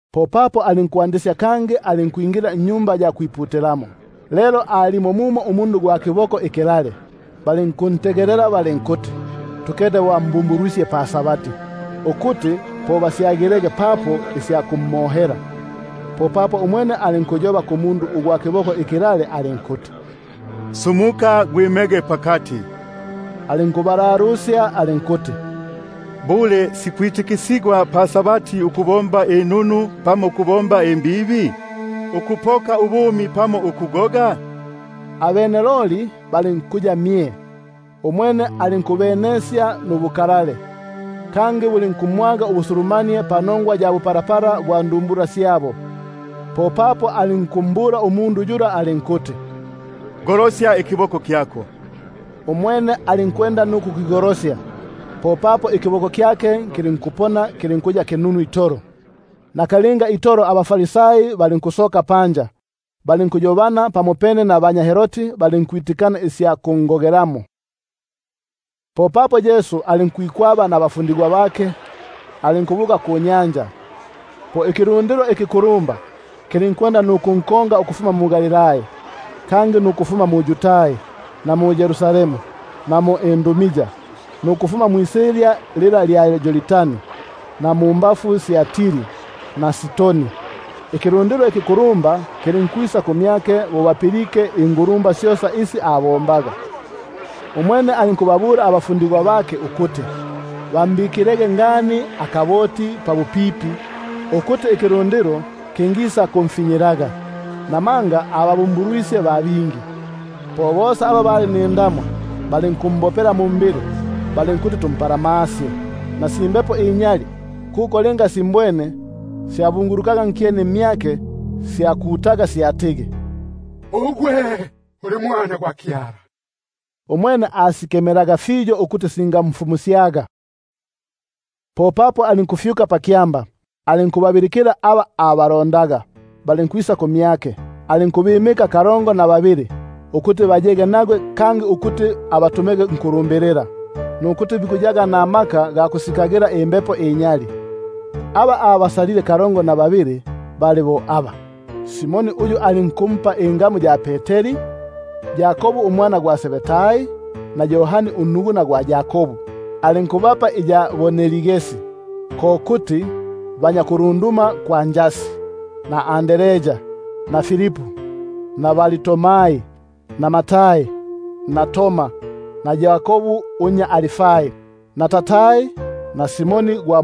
Popapo alinkwingila kangi mu-Sinagogi; lelo mo alimo mumo umundu ugwa kiboko ikilale. Balinkuntegelela balinkuti tukete bo ambumbulwisye pa-Sabati, ukuti po basyagilege papo isya kumohela. Po umwene alinkuyoba kumundu ugwa kiboko ikilale alinkuti: Sumuka gwime pakati. Alinkubalalusya alinkuti: Syo shiku isi sitikisigwe pa-Sabati, ukubomba inunu pamo ukubomba imbibi? Ukupoka ubumi pamo ukugoga? Abene loli balinkuya mye itolo. Bo abenesisye nubukalale, kangi bo bumwagile ubusulumanie panongwa ya bupalapala bwa ndumbula syabo, po alinkumbula umundu yula alinkuti: Golosya ikiboko kyako. Umwene alinkukigolosya, popapo ikiboko kyake lulinkuya kinunu itolo. Nakalinga itolo abaFarisai balinkusoka panja, balinkuyobana pamopene nabanya Herodi balinkwitikana isya kungogelamo. Popapo Yesu alinkwikwaba nabafundigwa bake, alinkubuka kunyanja; po ikilundilo ikikulumba kilinkunkonga ukufuma mu-Galilai; nukufuma mu-Yudai, na mu-Yerusalemu, na mu-Idumia, na mwisilya lila lya Yordani, na mumbafu sya Tiri na Sidoni, ikilundilo ikikulumba kilinkwisa kumyake bo bapilike ingulumba syosa isi abombaga. Umwene alinkubabula abafundigwa bake ukuti bambikilege ngani akaboti pabupipi, ukuti ikilundilo kingisakumfinyilaga; namanga ababumbulwisye ba bingi, fyobene bosa aba syabakufyaga indamwa, balinkumbopela mumbili balinkuti tumpalamasye. Na si mbepo inyali bo simbwene, silinkubunguluka nkyeni mmyake silinkukuta silinkuti: Ugwe uli Mwana gwa Kyala. Umwene alinkusikemela fiyo ukuti singamfumusyaga. Popapo alinkufyuka pakyamba, alinkubabilikila aba abalo- ndaga; abene balinkwisa kumyake. Alinkubimika kalongo na babili ukuti bo bayege nagwe, kangi ukuti bo abatumege ukulumbilila, alinkubapa amaka ga kusikagila imbepo inyali. Alinkubimika kalongo na babili: Simoni yo alinkumpa ingamu ya Peteri, na Yakobu unnya Zebedai na Yohani unnuguna gwa Yakobu, alinkubapa iya Boanergesi, ko kuti banya kulunduma kwa njasi; na Andrea na Filipu, na Bartolomai na Tomasi, na Yakobu unnya Alfai, na Tadai na Simoni gwa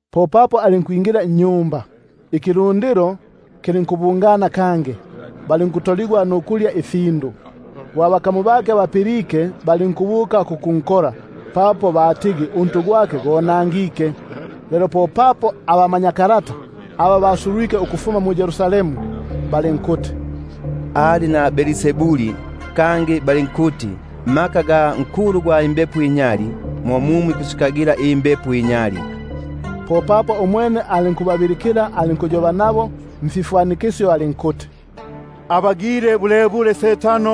Popapo alinkwingila nnyumba, ikilundilo kilinkubungana kangi, bunobuno balinkutoligwa nukulya ifindu. Lelo bo abakamu bake bapilike, balinkubuka kukunkola, papo batigi untu gwake gonangike. Lelo popapo abamanyakalata, aba basulwike ukufuma mu-Yerusalemu, balinkuti: Ali na Belzebuli; kangi balinkuti: Mu mmaka ga nkulu gwa mbepo inyali, mo mumo ikusikagila imbepo inyali. Umwene alinkubabilikila, alinkuyoba nabo mfifwanikisyo alinkuti: Ngimba Setano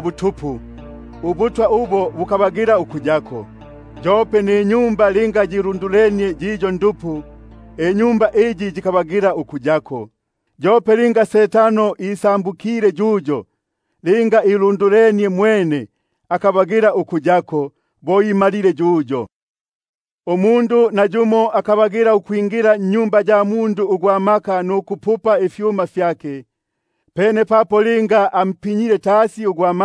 butupu, ubutwa ubo bukabagila ukuyako; yope ninyumba linga yilundulenie yiyo ndupu, inyumba iyo yikabagila uku- yako. Yope linga Setano isambukile yuyo, linga ilundulenie mwene, akabagila ukuyako; bo imalile yuyo. Nayumo umundu akamanya ukwingila nnyumba ya gwa maka nukupupa ifyuma fyake, pene papo linga ampinyile tasi ugwa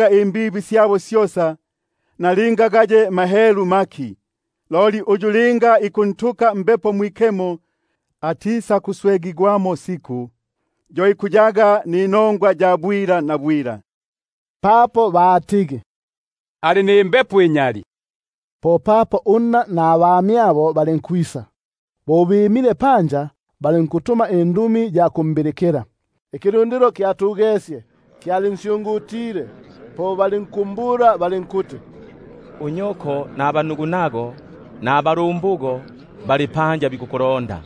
bandu, imbibi namahelu, nalinga gaye mahelu maki; loli uyu linga ikunhelula Mbepo Mwikemo, akaya nubuswe nasiku, yo ikuyaga ninongwa ya bwilabwila. Papo batigi: Ali nimbepo inyali. Popapo unna nabamyabo balinkwisa; bo bimile panja, balinkutuma indumi ya kumbilikila. Ikilundilo kyatugesye kyalinsyungutile, po balinkumbula balinkuti: Keta, unyoko nabanugunago, nabalumbugo bali panja bikukulonda.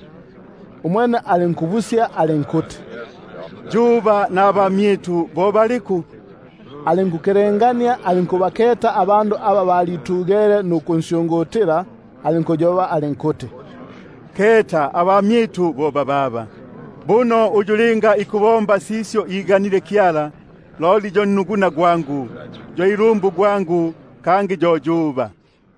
Umwene alinkubamula alinkuti: Yuba nabamyitu bo baliku? Bo akelengenie nukubaketa abandu aba balitugele nukunsyungutila, alinkuti: Keta yuba nabamyitu bo bababa. Buno uyu linga ikubomba sisyo iganile Kyala, yo nnuguna gwangu, yo ilumbu gwangu, kangi yo yuba.